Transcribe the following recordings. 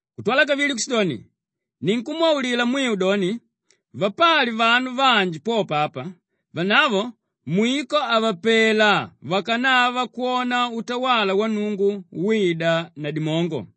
Kutwala kavili kushidoni, “Ninkumwaulila mwiu doni vapali vanu vanji popo apa, vanavo mwiko havapela vakanava kwona utawala wa Nnungu wida na dimongo.”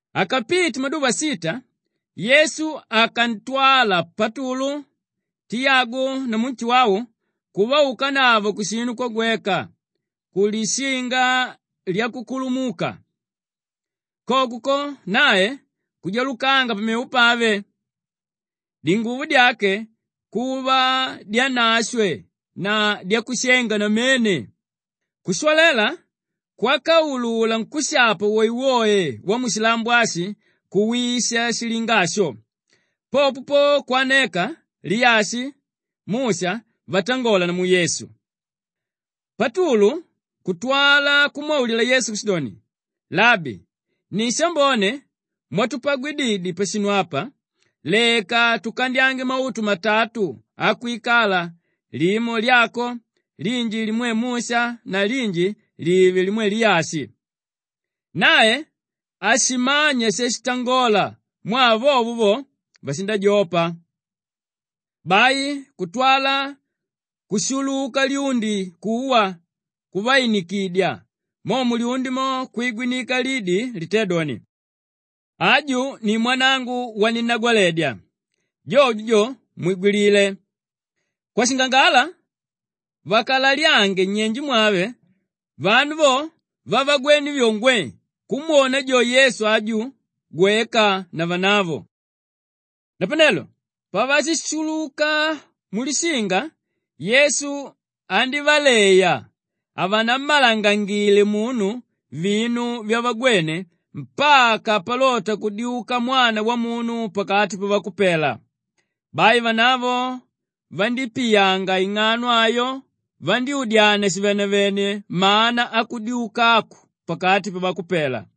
Akapite maduva sita, Yesu akantwala Patulu, Tiyagu namu Nshuwau kuvaukanavo kushinu kwagweka kulishinga lyakukulumuka. Koko ko, nae kujalukanga pamevo pave; dinguvo dyake kuva dyanashwe na dyakushenga namene, kushwalela kwákaulula nkúshapa woewoe wamushilambo ashi kuwisha shilinga asho. Popo po kwaneka Liyashi, Musha vatangola namu Yesu. Patulu kutwala kumwaulila Yesu kushidoni, “Labi, ni shambone mwatupagwididye pashinu apa, leka tukandyange mautu matatu akwikala limo lyako, linji limwe Musha na linji live limwe Liyashi.” Nae hashimanya shashitangola mwaa vovo vo vashindajopa. Bai kutwala kushuluka lyundi kuwa kuvainikidya, mo mulyundi mo kwigwinika lidi litédoni, “Aju ni mwanangu waninnagwaledya! Jojo jo mwigwilile!” Kwashingangala vakalalyange nyenje mwave vanu vo vavagwene vyo, ngwee kumwona jo Yesu aju gweka na vanavo. Napanelo pavashishuluka mulishinga Yesu andívaleya havanammalangangile munu vinu vyavagwene mpaka palota kudyuka Mwana Wamunu pakati pavakupela. Bai vanavo vandípiyanga ing'ano ayo vaudyania shivenevene mana akudyuka aku pakati pavakupela.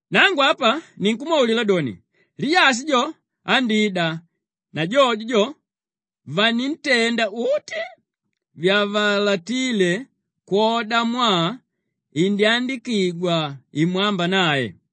Nangu apa ninkumwaulila doni, Liyashi jo andida na jojo jo, vanintenda uti vyavalatile kwodamwaa indyandikigwa imwamba nae.”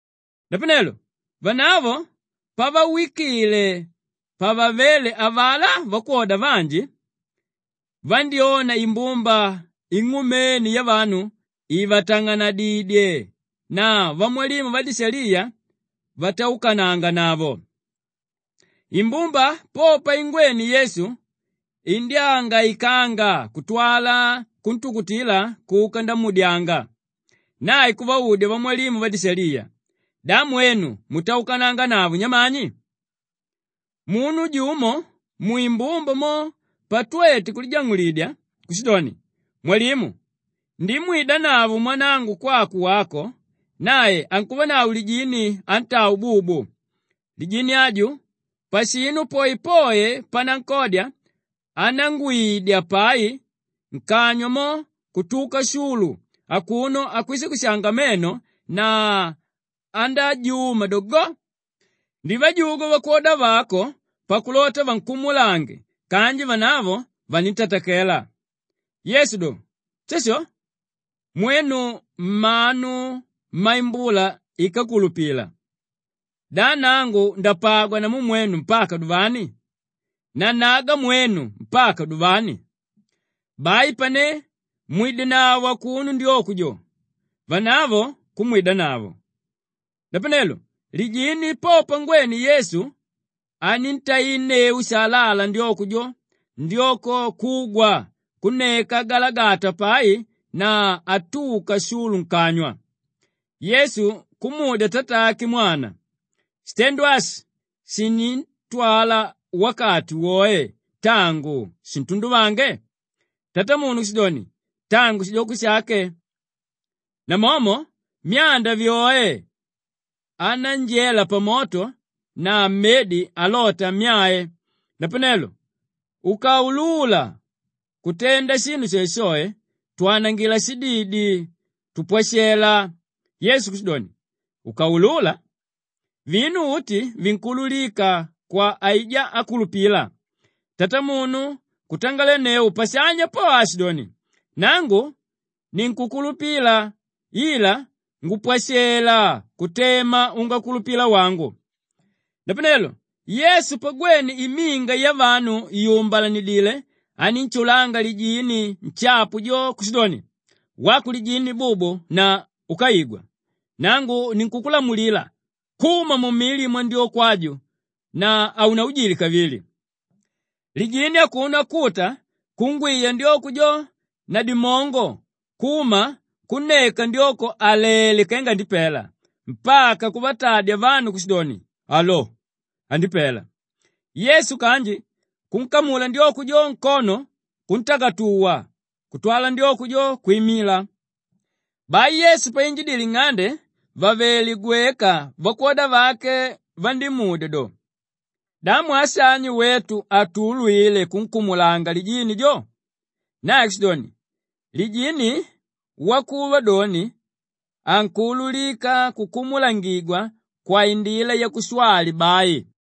Napanelo vanavo pavawikile pavavéle avalá vakwoda vanji vandyóna imbumba ing'umene yavanu ivatang'anadidye na vamwalimu vadishaliya vataukananganavo. Imbumba po paingwene Yesu indyángaikanga kutwala kuntukutila kuka ndamuudyanga. Nae kuvaudya vamwalimu vadishaliya, “Da mwenu mutaukananganavo nyamani?” Munu jumo mwimbumba mo patwete kulijang'ulidya kushidoni, “Mwalimu, ndimwidanavo mwanangu kwako wako, nae ankuvanavo lijini ántaa ububu. Lijini aju pashinu poepoe panankodya, anángwiidya pai, nkanywa mo kutuka shulu akuno akwishakwishanga meno na andájuma do, go. Ndivajugwa vakwoda vako pakulota vankumulange kanji vanavo vanintatakela.” Yesu do, “Shasho! Mwenu mmanu mmaimbula íkakulupila! Da nangu ndapagwa namu mwenu mpaka duvani? Nannaga mwenu mpaka duvani? Bai pane mwidenavo akuno ndyoko jo!” Vanavo kumwidanavo. Napanelo lijini po pangwene Yesu aníntainneu shalala ndyoko jo, ndyoko kugwa kunneka agalagata pai na atuka shulu nkanywa. Yesu kumudya tatake mwana, “Shitendo ashi shinditwala wakati woe tangu shintunduvange?” Tatamunu kushidoni, “Tangu shidyoko shake. Nomomo myanda vyoe anánjela pamoto na mmedi alota ammyae. Napanelo ukaulula kutenda shinu shoeshoe, twanangila shididi, tupwashela!” Yesu kushidoni, “Ukaulula? Vinu uti vinkuululika kwa aijá ákulupila.” Tatamunu kutangalenneu pashanya po aashidoni, “Nangu ninkukulupila ila ngupwashela kutema ungakulupila wangu.” Napanelo Yesu pagwene iminga yavanu yumbalanila anínshulanga lijini nshapu jo kushidoni, “Wako lijini bubu na úkaigwa, nangu ninkukulamulila kuma mumili mwandyoko aju na haunainjile kavili!” Lijini akuno akuta kungwiya ndyoko jo na dimongo kuma kunneka ndyoko àlele kenga andipela mpaka kuvatadya vanu kushidoni, “Alo, andipela!” Yesu kanji kunkamula ndyoko jo nkono kuntakatuwa kutwala ndyoko jo kwimila. Bai Yesu painjidile nng'ande vàvele gweka vakwoda vake vandímudya doni, “Da mwaa shani wetu hatuulwile kunkumulanga lijini jo?” Nae kushidoni, “Lijini wakuva doni ankuululika kukumulangigwa kwaindila yakushwali bai.”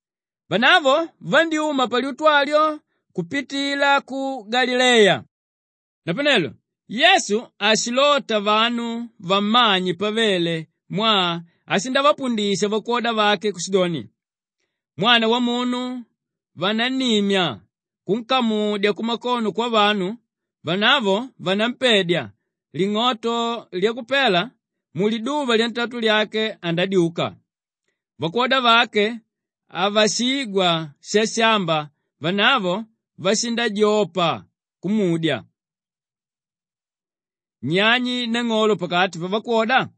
Vanavo vandyúma palyutu alyo kupitila ku Galileya. Napanelo Yesu hashilota vanu vammanye pavele mwaa ashindavapundisha vakwoda vake kushidoni, “Mwana Wamunu vanannimya kunkamudya kumakono kwavanu, vanavo vanampedya, ling'oto lyakupela, muliduva lyantatu lyake andadyuka.” Vakwoda vake havashigwa shashamba vanavo vashindajopa kumudya. Nyani nang'olo pakati pavakwoda?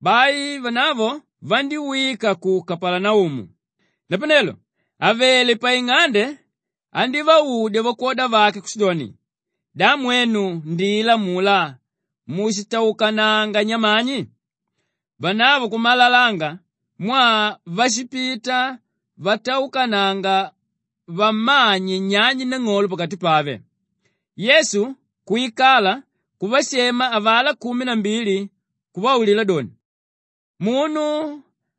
Bai vanavo vandíwika ku Kapalanaumu. Napanelo àvele paing'ande andívaudya vakwoda vake kushidoni, “Da mwenu ndila amulá mushitaukananga nyamani?” Vanavo kummalalanga mwaa vashipita vataukananga vammanye nyani nang'olo pakati pave. Yesu kwikala kuvashema avalá kumi na mbili kuvaulila doni, “Munu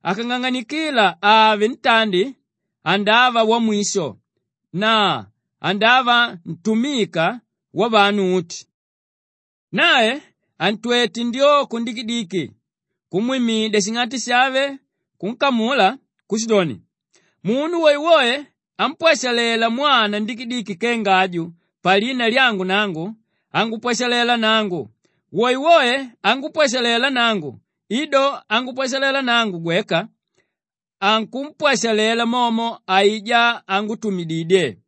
akang'ang'anikila ave ntandi andava wamwisho na andava ntumika wavanu uti.” Nae antwete ndyoko ndikidiki kumwimidya shing'ati shave kunkamula kushidoni, “Munu woewoe ámpwashalela mwana ndikidiki kenga aju palina lyangu nangu, angupwashalela nangu; woewoe ángupwashalela nangu i do angupwashalela nangu gweka, ankumpwashalela momo aijá ángutumididye.”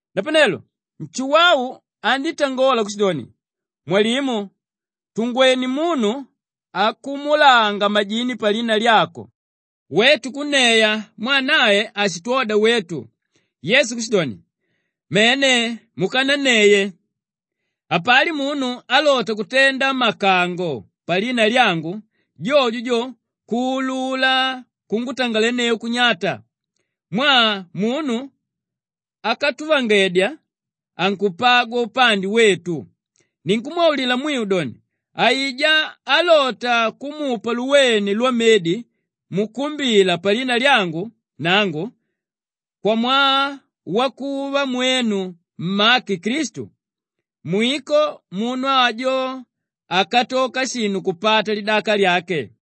Napanelo Nshuwau andítangola kushidoni, “Mwalimu, tungwené munu akumulanga majini palina lyako, wetu kunneya mwaa nae hashitwoda wetu.” Yesu kushidoni, “Mene, mukananneye. Hapali munu álota kutenda makango palina lyangu, jojo jo kuulula kungutangalenneu kunyata mwaa munu ákatuvangedya ankupagwa upande wetu. Ninkumwaulila mwiu doni, aijá álota kumupa luwene lwamedi mukumbila palina lyangu nangu kwamwaa wakuva mwenu mmake Klistu, mwiko munu ajo hakatoka shinu kupata lidaka lyake.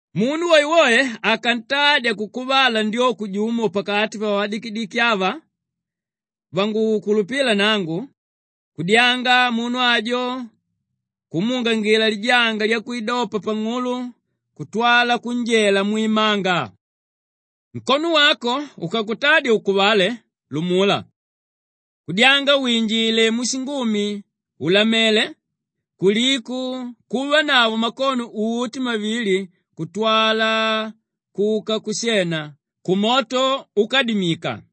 “Munu woewoe akantadya kukuvala ndyoko jumo pakati pavadikidiki ava vangukulupila nangu, kudyanga munu ajo kumuungila lijanga lyakwidopa pang'ulo kutwala kunjela mwimanga. “Nkono wako ukakutadya ukuvale, lumula. Kudyanga kwinjila mushingumi ùlamele kuliko kuvanavo makono uti mavili kutwala kuka kushena kumoto úkadimika.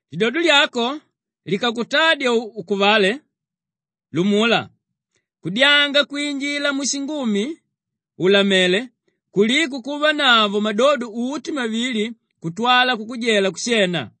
Lidodo lyako likakutadya ukuvale, lumula. Kudyanga kwinjila mushingumi ùlamele kuliko kuvanavo madodo uti mavili kutwala kukujela kushena.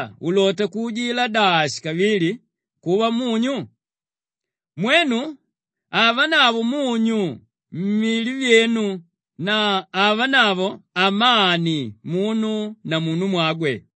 Munyu, wambone kanji ukadalala ulota kuujidya dashi kavili kuva munyu? Mwenu avanavo munyu mmili myenu na avanavo amani munu na munumwagwe.”